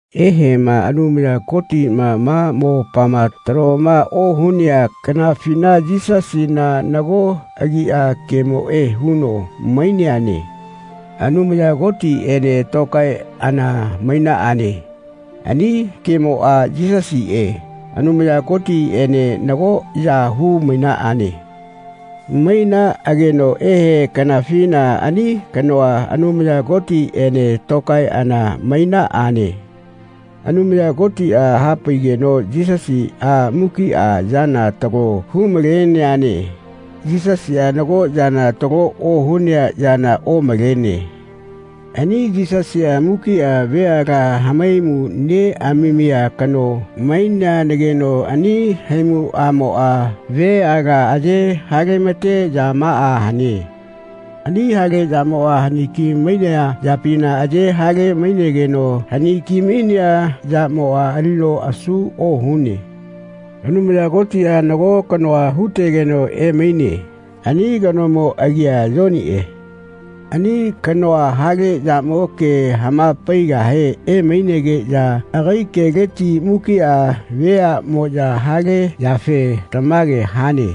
Eheꞌma Anumaya Kotiꞌma ma mopama taloma ohunea kanafina Yisasina nago agia Kemoꞌe huno maineane. Anumaya Kotiꞌene tokaeꞌana mainaꞌane. Ani Kemoꞌa, Yisasiꞌe, Anumaya Kotiꞌene nagoꞌya hu-mainaꞌane. Mainaꞌageno ehe kanafina ani kanoa Anumaya Kotiꞌene tokaeꞌana mainaꞌane. Anumaya Kotiꞌa hapaigeno Yisasiꞌa mukiꞌa yana talo hu-maleneane. Yisasiꞌa nago yana talo ohunea yana omalene. Ani Yisasiꞌa mukiꞌa veala hamaimu neꞌamamia kano maineanagino ani haimuꞌamoꞌa veala aye hale-ma-te yamaꞌa hane. Ani hale yamoꞌa haniki mainea yapina aye hale-mainegeno hani-ki-mainea yamoꞌa alino asu ohune. Anumaya Kotiꞌa nago kanoa hu-tegeno emaine. Ani kanomo agia Yoniꞌe. Ani kanoa hale yamo ke hama-paigahe emainegeꞌya agai keleti mukiꞌa veaꞌmoꞌya hale yafe “Tamage hane.”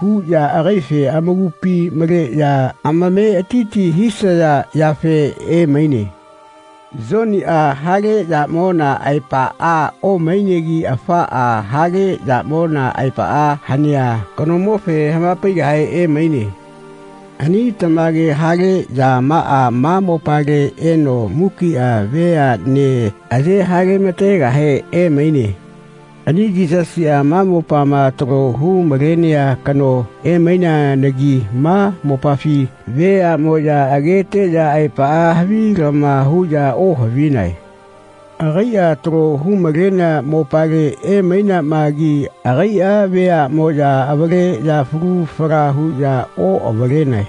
huꞌya agaife amakupi maleꞌya ametiti hisaya yafe emaine. Yoniꞌa hale yamona aepaꞌa omainegi afaꞌa hale yamona aepaꞌa hanea kanomofe hama-paigahe emaine. Ani tamage hale yamaꞌa ma mopale eno mukiꞌa veaꞌne aye hale-ma-tegahe emaine. Ani Yisasiꞌa ma mopama talo hu-malenea kano emaineanagi ma mopafi veaꞌmoꞌya ageteꞌya aepaꞌa havilama huꞌya ohavinae. Agaiꞌa talo hu-malenea mopale emaineamagi agaiꞌa veaꞌmoꞌya avaleꞌya falu fala huꞌya oꞌavalenae.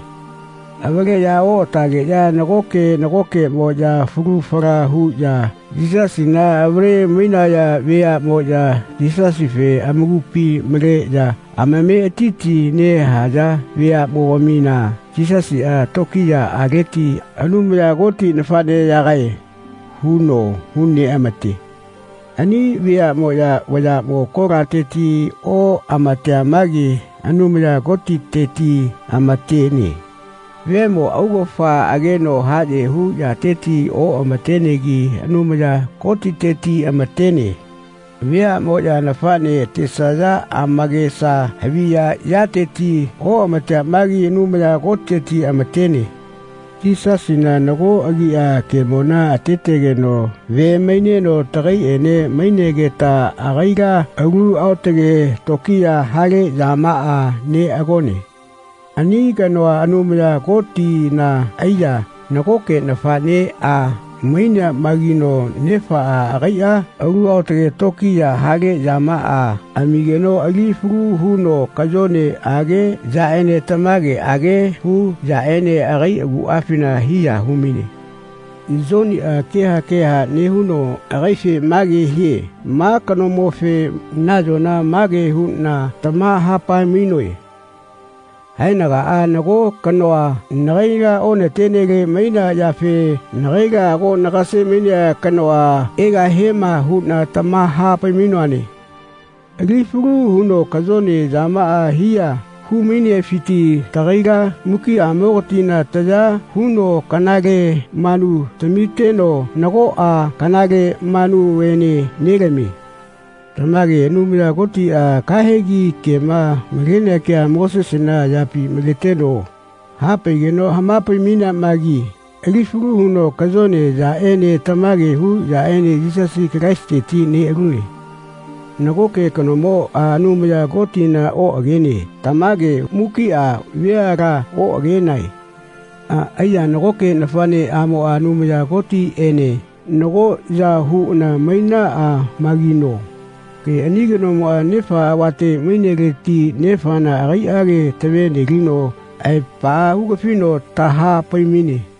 Avaleꞌya oꞌatageꞌya nagoke nagokeꞌmoꞌya falu fala huꞌya Yisasina avale-mainaya veaꞌmoꞌya Yisasife amakupi maleꞌya amametiti nehaya veaꞌmogamina Yisasiꞌa tokiyaꞌaleti “Anumaya Koti nafaꞌneyagae.” huno hu-neꞌama-te. Ani veaꞌmoꞌya vayaꞌmo kolateti oꞌama-temagi Anumaya Kotiteti ama-tene. Vemo augafa ageno haꞌye hu yateti oꞌamatenegi Anumaya Kotiteti amatene. Veaꞌmoꞌya nafaꞌne atesaya amakesa haviya yateti oꞌamatemagi Anumaya Kotiteti amatene. Yisasina nago agiꞌa Kemona atetegeno ve maineno tagaiꞌene mainegeta agaila alu aotage tokiya hale yamaꞌa neꞌagone. Ani kanoa Anumaya Kotina aiya nagoke nafaꞌneꞌa maineamagino nefaꞌa agaiꞌa alu aotage tokiya hale yamaꞌa amigeno ali falu huno kayoneꞌage yaꞌene tamageꞌage hu yaꞌene agai aguꞌafina hiya hu-maine. Yoniꞌa keha keha nehuno agaife mage hie “Ma kanomofe nayona mage huꞌna tamaha-pai-mainoe haenagaꞌa nago kanoa nagaila onatenele mainea yafe nagaila ago nagase-mainea kanoa egahiema huꞌna tamaha-pai-mainoane.” Ali falu huno kayone yamaꞌa hiya hu-mainefiti tagaila mukiꞌamogatina taya huno kanale manu tamiteno nagoꞌa kanale manuene nelamie. Tamage Anumaya Kotiꞌa kahegi kema malenea kea Mosesena ayapi maleteno hapaigeno hama-pai-mainiamagi ali falu huno kayone yaꞌene tamage hu yaꞌene Yisasi Kalaisiteti neꞌalune. Nagoke kanomoꞌa Anumaya Kotina oꞌagene. Tamage mukiꞌa veala oꞌagenae. Aiya nagoke nafaꞌneꞌamoꞌa Anumaya Kotiꞌene nagoꞌya huꞌana mainaꞌamagino ani kanomoꞌa Nefa avate maineleti Nefana agaiꞌage tave-nelino aepaꞌa hu-gafino taha-pai-maine.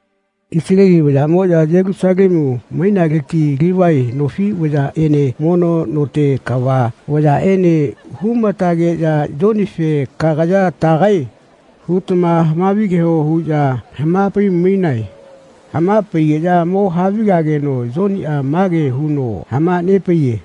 Isaleli vayaꞌmoꞌya Yelusalemu mainaleti Livae nofi vayaꞌene mono note kava vayaꞌene hu-ma-tageꞌya Yonife “Kagaya tagae?” hutama havigeho huꞌya hama-pai-mainae. Hama-paigeꞌya mo havigageno Yoniꞌa ma ke huno hama-nepaiye.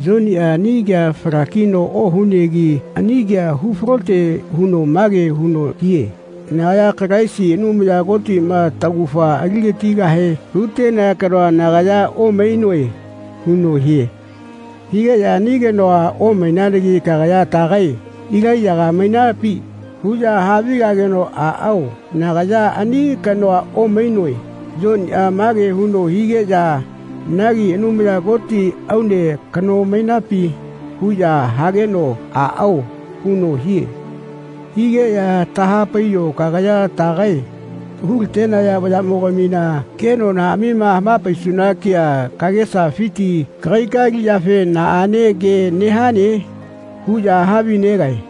Yoniꞌa ani ke fala-kino ohunegi ani kea hu falote huno mage huno hie “Nagaya Kalaisi, Anumaya Kotiꞌma taugafa ali-gatigahe hu-tenea kanoa nagaya omainoe.” huno hie. Higeꞌya “Ani kanoa omaimagi kagaya tagae? Ilaiyaga mainapi?” huꞌya havigageno “Aꞌao nagaya ani kanoa omainoe.” Yoniꞌa make huno higeꞌya “Nagi Anumaya Koti aune kano mainapi?” huꞌya hageno “Aꞌao.” huno hie. Higeꞌya “Taha-paiyo kagaya tagae? Hu-la-tenaya vayaꞌmogamina kenonaꞌamima hama-paisuna kea kagesafiti kagaika aliꞌyafe naꞌane ke nehane?” huꞌya havi-negae.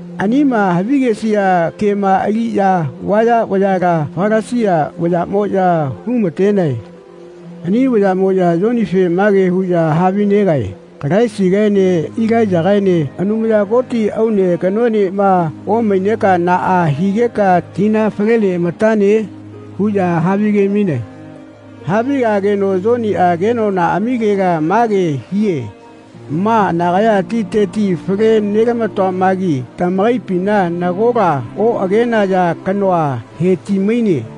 Anima havigesia kema aliꞌya vaya vayala Falasia vayaꞌmoꞌya hu-ma-tenae. Ani vayaꞌmoꞌya Yonife mage huꞌya havi-negae “Kalaisigaene Ilaiyagaene Anumaya Koti aune kanoenema omaineka naꞌa higeka tina fale neꞌamatane?” huꞌya havi-ge-mainae. Havigageno Yoniꞌa kenonaꞌamilela mage hie “Ma nagaya titeti fale nelama-toamagi tamakaipina nagola oꞌagenaya kanoa he-ti-maine.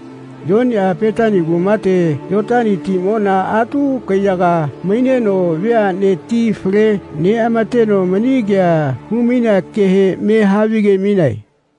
Yoniꞌa Petani kumate Yotani timona atu kaiyaga maineno veaꞌne ti fale neꞌama-teno mani kea hu-mainea kehe mehavi-ge-mainae.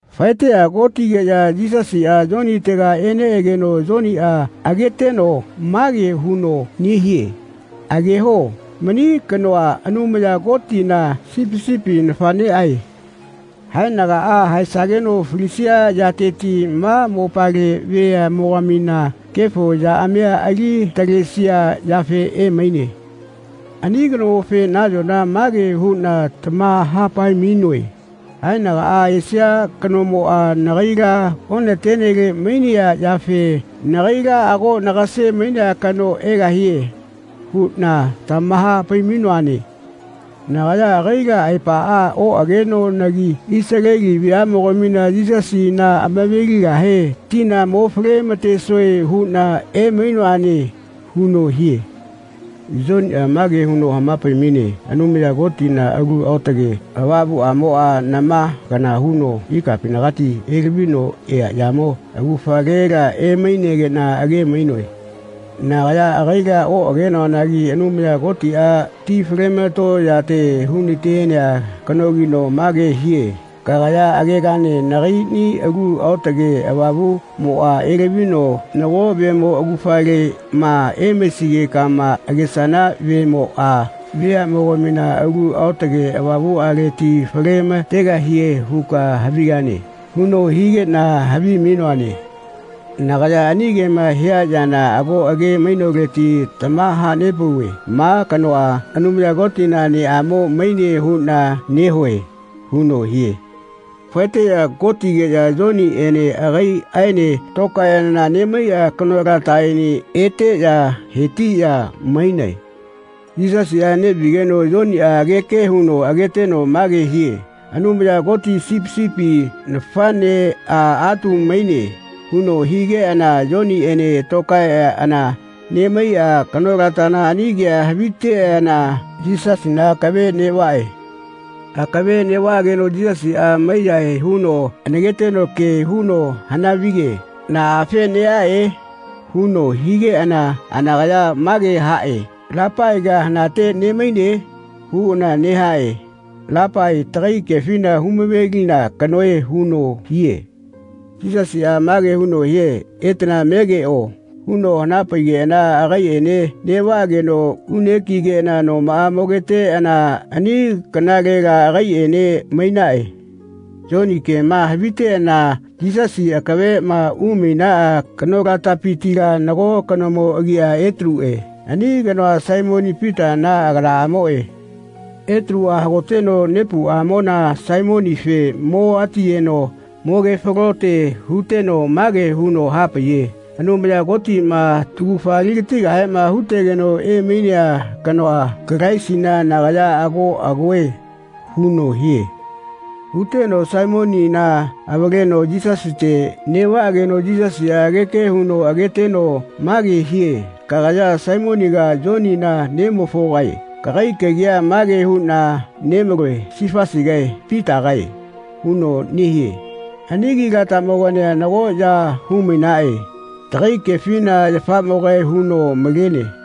Faeteꞌya kotigeꞌya Yisasiꞌa Yonitega eneꞌegeno Yoniꞌa ageteno mage huno nehie “Ageho mani kanoa Anumaya Kotina Sipi sipi nafaꞌneꞌae. Haenagaꞌa haesageno falisia yateti ma mopale veaꞌmogamina kefo yaꞌamia ali-talesia yafe emaine. Ani kanomofe nayona mage huꞌna tamaha-pai-mainoe ‘Haenagaꞌa esia kanomoꞌa nagaila onatenele mainea yafe nagaila ago nagase-mainea kano egahie.’ huꞌna tamaha-pai-mainoane. Nagaya agaila aepaꞌa oꞌagenoanagi Isaleli veaꞌmogamina Yisasina amave-ligahe tina mo fale-ma-tesoe huꞌna emainoane.” huno hie. Yoniꞌa mage huno hama-pai-maine “Anumaya Kotina Alu Aotage Avamuꞌamoꞌa nama kana huno ikapinagati elavino eaꞌyamo augafalela emainegeꞌna age-mainoe. Nagaya agaila oꞌagenoanagi Anumaya Kotiꞌa ti fale-ma-to yate hu-natenea kanogino mage hie ‘Kagaya agegane nagaiꞌni Alu Aotage Avamuꞌmoꞌa elavino nago vemo augafaleꞌma emaisigekama agesana vemoꞌa veaꞌmogamina Alu Aotage Avamuꞌaleti fale-ma-tegahie huka havigane.’ huno higeꞌna havi-mainoane. Nagaya ani kema hia yana ago age-mainoleti tamaha-nepauve ma kanoa Anumaya Kotina neꞌamo maine huꞌna nehue.” huno hie. Faeteꞌya kotigeꞌya Yoniꞌene agaiꞌaene tokaeꞌana nemaiꞌa kanolataꞌene eteꞌya he-tiꞌya mainae. Yisasiꞌa neꞌvigeno Yoniꞌa ageke huno ageteno mage hie “Anumaya Koti Sipi sipi nafaꞌnea atu maine.” huno higeꞌana Yoniꞌene tokaeꞌana nemaiꞌa kanolatana ani kea haviteꞌana Yisasina akave neꞌvaꞌe. Akave neꞌvaꞌageno Yisasiꞌa mai-yahae huno anaketeno ke huno hana-vige “Naꞌafe neꞌaꞌe?” huno higeꞌana anakaya mage haꞌe “Lapaiga hanate nemaine?” huꞌana nehaꞌe. Lapai tagai kefina hu-mave-lina kanoe huno hie. Yisasiꞌa mage huno hie “Etana megeꞌo.” huno hana-paigeꞌana agaiꞌene neꞌvaꞌageno une kigeꞌana nomaꞌa mogeteꞌana ani kanalela agaiꞌene mainaꞌe. Yoni kema haviteꞌana Yisasi akaveꞌma umainaꞌa kanolatapitila nago kanomo agia Etaluꞌe ani kanoa Saimoni Pitana aganaꞌamoꞌe. Etaluꞌa hagoteno nepuꞌamona Saimonife mo atiyeno mogefalote huteno mage huno hapaiye “Anumaya Kotiꞌma taugafa ali-gatigahema hu-tegeno emainea kanoa Kalaisina nagaya ago agoe.” huno hie. Huteno Saimonina avaleno Yisasite neꞌvaꞌageno Yisasiꞌa ageke huno ageteno mage hie “Kagaya Saimoniga Yonina nemofogae kagai kagia mage huꞌna nemaloe Sifasigae Pitagae.” huno nehie. Ani agilatamogania nagoꞌya hu-mainaꞌe. Tagai kefina yafaꞌmogae huno malene.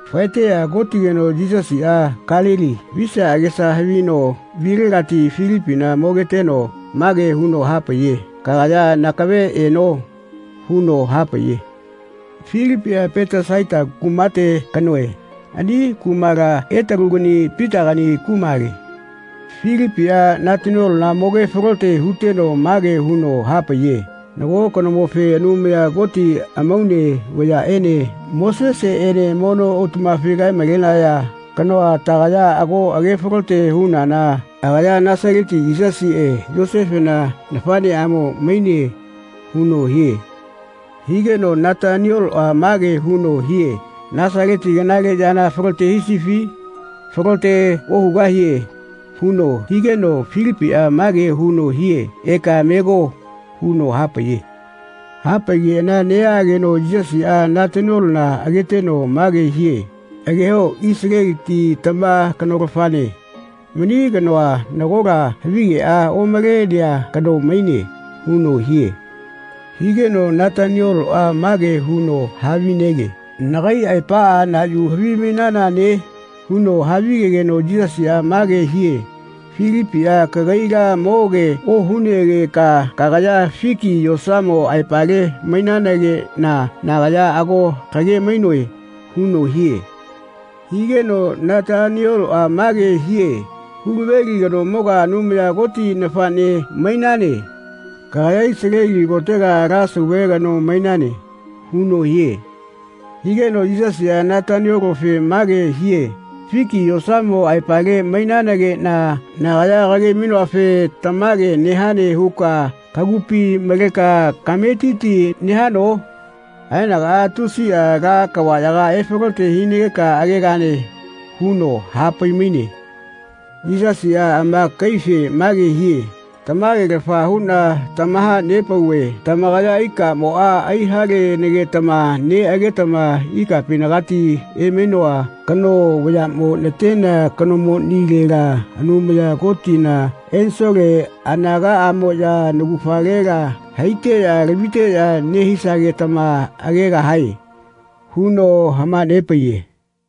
Faeteꞌya kotigeno Yisasiꞌa Kalili visia agesa havino vilegati Filipina mogeteno mage huno hapaiye “Kagaya nakave eno.” huno hapaiye. Filipiꞌa Petesaita kumate kanoe. Ani kumala Etalugani Pitagani kumale. Filipiꞌa Nataniolona moge-falote huteno mage huno hapaiye “Nago kanomofe Anumaya Koti amaune vayaꞌene Moseseꞌene mono autaꞌmafi kae-malenaya kanoa tagaya ago age-falote hunana agaya Nasaleti Yisasiꞌe Yosefena nafaꞌneꞌamo maine.” huno hie. Higeno Natanioloꞌa mage huno hie “Nasaleti kanale yana falote hisifi? Falote ohugahie.” huno higeno Filipiꞌa mage huno hie “Eka mego.” huno hapaiye. Hapaigeꞌana neꞌaꞌageno Yisasiꞌa Nataniolona ageteno mage hie “Ageho Isaleliti tama kanolafane. Mani kanoa nagola havigeꞌa omalenea kano maine.” huno hie. Higeno Natanioloꞌa mage huno havinege “Nagai aepaꞌa na yu havimainanane?” huno havigegeno Yisasiꞌa mage hie “Filipiꞌa kagaila moge ohunegeka kagaya fiki yosamo aepale mainanageꞌna nagaya ago kage-mainoe.” huno hie. Higeno Natanioloꞌa mage hie “Hulaveli kanomoga Anumaya Koti nafaꞌne mainane. Kagaya Isaleli kotega ala sauve kano mainane.” huno hie. Higeno Yisasiꞌa Nataniolofe mage hie “Fiki yosamo aepale mainanageꞌna nagaya kage-mainoafe tamage nehane huka kagupi maleka kametiti nehano? Haenagaꞌa tusiꞌa ala kavaꞌyaga efalote hinageka agegane.” huno hapai-maine. Yisasiꞌa amakaife mage hie “Tamagelafa huꞌna tamaha-nepauve tamakaya ikamoꞌma ai-halenagetama neꞌagetama ikapinagati emainoa kano vayaꞌmo natenea kanomonilela Anumaya Kotina ensole anagaꞌamoꞌya naugafalela haiteꞌya laviteꞌya nehisagetama agegahae.” huno hama-nepaiye.